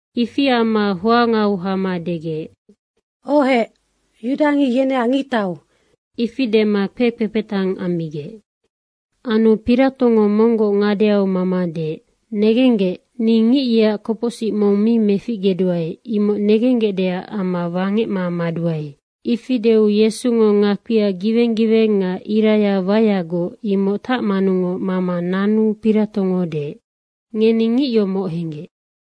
Ifi amma hoangau hama degec, “Ohec, yudangic yeneac ngictau.” Ifi dema kpekpepetang ammigec. Anu Piratongo monggoc ngadeau mama deec, “Negenggec, ni ngic yeac kopocsic mong mi meficgeduae, imoc negenggecdeac amma wangecma maduae.” Ifi deu Yesungo ngakpia giweng giweng nga iraya waeagoc, imoc tacmanungoc mama nanu Piratongo deec, “Ngeni ngic yomoc henggec.”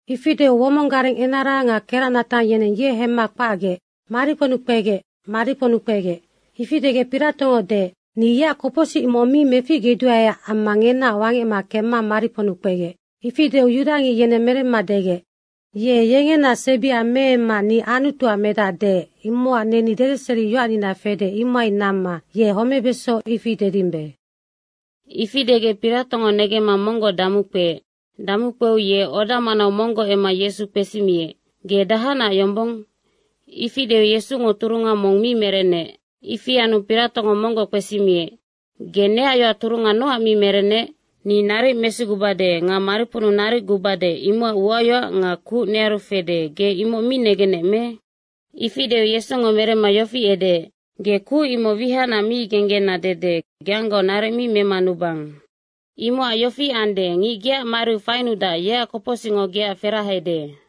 Ifi deu womong gareng enara nga keracnatang yeneng ye hemma kpacgec, “Mariponnu kpegec, mariponnu kpegec!” ifi degec Piratongo deec, “Ni yeac kopocsic mong mi meficgeduaeac amma ngenaoc wangecma kemma mariponnu kpegec.” Ifi deu yudangic yeneng meremma degec, “Ye yengena sebia meemma ni Anutuac medac deec, imocac neni dedeseriyoacnina fede, imohai namma ye homebeso, ifi dedimbe.” Ifi degec Piratongo negemma monggoc damukpeec. Damukpeu ye oda manau monggoc emma Yesu kpesimiec, “Ge dahacnac yombong?” ifi deu Yesungo turunga mong mi merenec. Ifi anu Piratongo monggoc kpesimiec, “Ge neac yoac turunga nocac mi merennec? Ni naric mesigubade nga mariponnu naric gubade, imocac uayoac nga kuc nearu fede, ge imoc mi negennec me?” Ifi deu Yesungo meremma yofi edeec, “Ge kuc imoc wihacnac mi genggena dede geanggaoc naric mi memanubang. Imocac yofi ande, ngic geac mariu fainudac, yeac kopocsicngo geac ferahede.”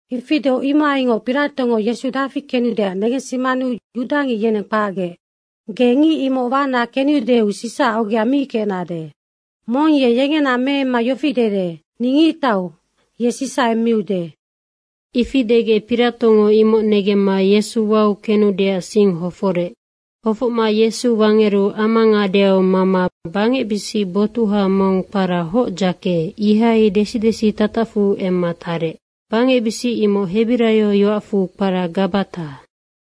Ifi deu imohaingoc Piratongo Yesu dafi kenudeac negensimanu yudangic yeneng kpacgec, “Ge ngic imoc wana kenudeu Sisaac ogea mi kecnade. Mong ye yengena meemma yofi dede, ‘Ni ngictau.’ ye Sisa emmiude.” Ifi degec Piratongo imoc negemma Yesu wau kenudeac sing hoforec. Hofocma Yesu wangeru ama ngadeau mama bangecbisic botuha mong kpara Hocdzake, ihai desi desitatacfu emma tarec. Bangecbisic imoc hebiraio yoacfu kpara Gabata.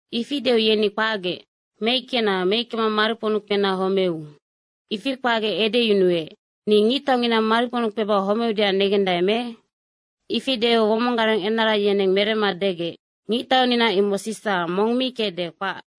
Ifi deu yeni kpacgec, “Meickena, meickema mariponnu kpena homeu!” Ifi kpacgec edeyunuec, “Ni ngictaungina mariponnu kpeba homeudeac negendae me?” Ifi deu womong gareng enara yeneng meremma degec, “Ngictaunina imoc Sisa, mong mi kecde, kpac.”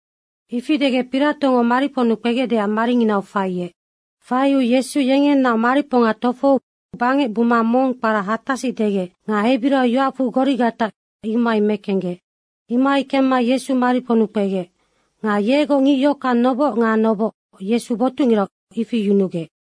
Ifi degec Piratongo mariponnu kpegecdeac maringinau faiec. Faiu Yesu yengenaoc mariponga tofohou bangec buma mong kpara Hatasic degec nga hebiraio yoacfu Gorigata, imohai mekenggec. Imohai kemma Yesu mariponnu kpegec. Nga yegoc ngic yohockang noboc nga noboc Yesu botucngirau, ifi yunugec.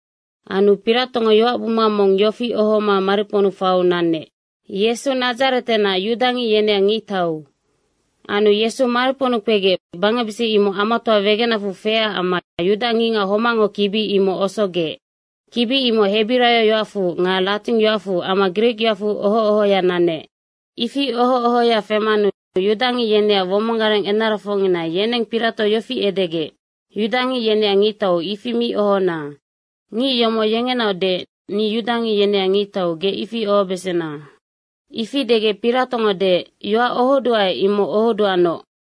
Anu Piratongo yoacbuma mong yofi ohoma mariponnu faiu nanec, “Yesu Nadzaretenac, yudangic yeneac ngictau.” Anu Yesu mariponnu kpegec, bangecbisic imoc amatoa wegenacfu feecac amma yudangicngac homacngo kibi imoc osogec. Kibi imoc hebiraio yoacfu nga latingyoacfu amma grikyoacfu oho ohoya nanec. Ifi oho ohoya femanu yudangic yeneac womong gareng enarafocngina yeneng Pirato yofi edegec, “Yudangic yeneac ngictau, ifi mi ohona. Ngic yomoc yengenaoc deec, ni yudangic yeneac ngictau, ge ifi ohobesena.” Ifi degec Piratongo deec, “Yoac ohoduae, imoc ohoduanoc.”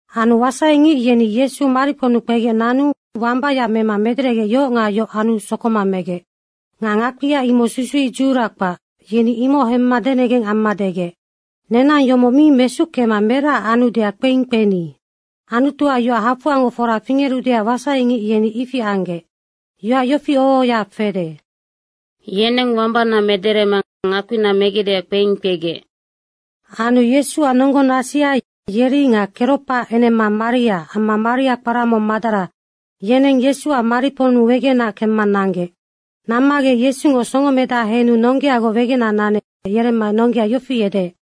Anu wasaingic yeni Yesu mariponnu kpegec nanu wambaya mema mederegec, yohoc nga yohoc anu sokoma megec. Nga ngakpia imoc susuic dzuhura kpac, yeni imoc hemma denengeng amma degec, “Nenang yomoc mi mesuckema meracac anudeac kpeing kpeni.” Anutuac yoac hafoangoc fora fingerudeac wasaingic yeni ifi anggec. Yoac yofi oho ohoya fede, “Yeneng wambana mederema ngakpina megecdeac kpeing kpegec.” Anu Yesuac nonggonasia yeri nga Keropaac enema Maria amma Maria kpara mong Madara, yeneng Yesuac mariponnu wegenac kemma nanggec. Nammagec Yesungo songomedaha henu nonggeagoc wegenac nanec yeremma nonggea yofi edeec,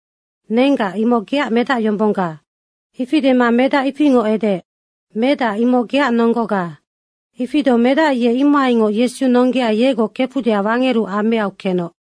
“Nenggac, imoc geac medacyombongga.” Ifi dema medac, ifingoc edeec, “Medac, imoc geac nonggoga.” Ifi deu medac ye imohaingoc Yesu nonggea yegoc kefudeac wangeru ameau kenoc.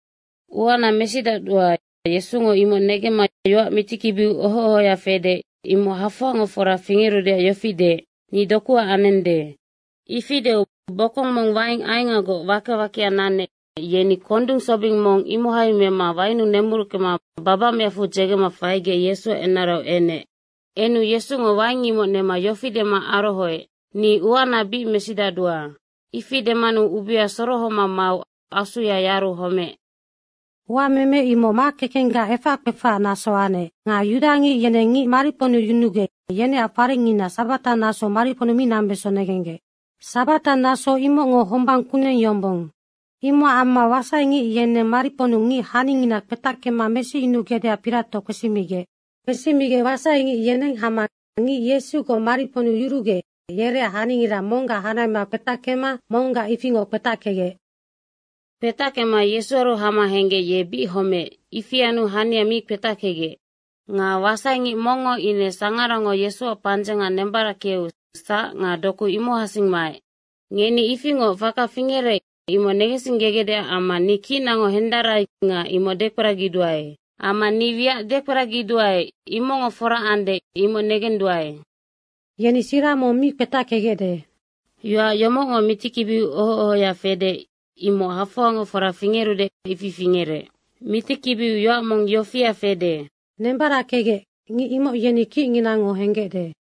Uana mesidacdua, Yesungo imoc negemma yoac mitikibiu oho ohoya fede, imoc hafoangoc fora fingerudeac yofi deec, “Ni dokuac anende.” Ifi deu bokong mong waing aengagoc wake wakea nanec, yeni kondung sobing mong imohai mema wainnu nemuruckema babacmeacfu dzegema faigec Yesuac enarau enec. Enu Yesungo waing imoc nema yofi dema arohoec, “Ni uana bic mesidacdua.” Ifi demanu ubea sorohoma mau asuya yaru homeec. Uameme imoc makekenggac efac kpefacac naso anec. Nga yudangic yeneng ngic mariponnu yunugec, yeneac farengngina sabata nasou mariponnu mi nambeso negenggec. (Sabata naso imocngo hombang kuneng yombong.) Imocac amma wasaingic yeneng mariponnu ngic haningina kpetackema mesiyunugecdeac Pirato kpesimigec. Kpesimigec wasaingic yeneng hama ngic Yesugoc mariponnu yurugec, yereac haningira monggac hanahema kpetackema monggac ifingoc kpetackegec. Kpetackema Yesuaru hama henggec, ye bic homeec, ifi anu hania mi kpetackegec. Nga wasaingic mongngo ine sangarango Yesuac pandzenga nembarackeu sac nga doku imohacsing maec. Ngeni ifingoc faka fingerec, imoc negensinggegecdeac amma ni kicnango hendarai nga imoc dekperagiduae. Amma ni wiac dekperagiduae, imocngo fora ande, imoc negenduae. “Yeni sira mong mi kpetackegecde.” Yoac yomocngo mitikibiu oho ohoya fede, imoc hafoangoc fora fingerudeac ifi fingerec. Mitikibiu yoac mong yofia fede, “Nembarackegec, ngic imoc yeni kicnginango henggecde.”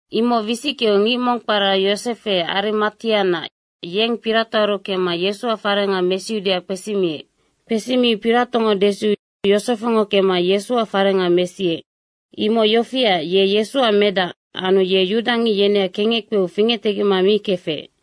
Imoc wisickeu ngic mong kpara Yosefe Arimatianac, yeng Piratoaru kemma Yesuac fareng mesiudeac kpesimiec. Kpesimiu Piratongo desiu Yosefengo kemma Yesuac farenga mesiec. Imoc yofiac, ye Yesuac medac anu ye yudangic yeneac kengec kpeu fingectegecma mi kefec.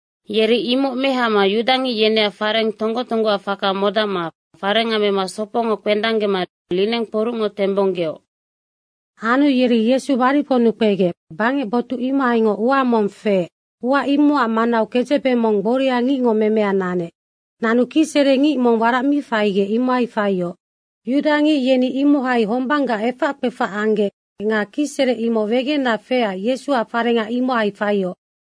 Yeri imoc mehama yudangic yeneac fareng tonggo tonggoac faka modacma farenga mema sopongo kpedanggema lineng kporucngo tembonggeoc. Anu yeri Yesu mariponnu kpegec, bangec botuc imohaingoc ua mong feec, ua imocac manau kedzebe mong gboria ngicngo memea nanec. Nanu kicsere ngic mong warac mi faigec, imohai faioc. Yudangic yeni imohai hombanggac efac kpefac anggec nga kicsere imoc wegenac feecac Yesuac farenga imohai faioc.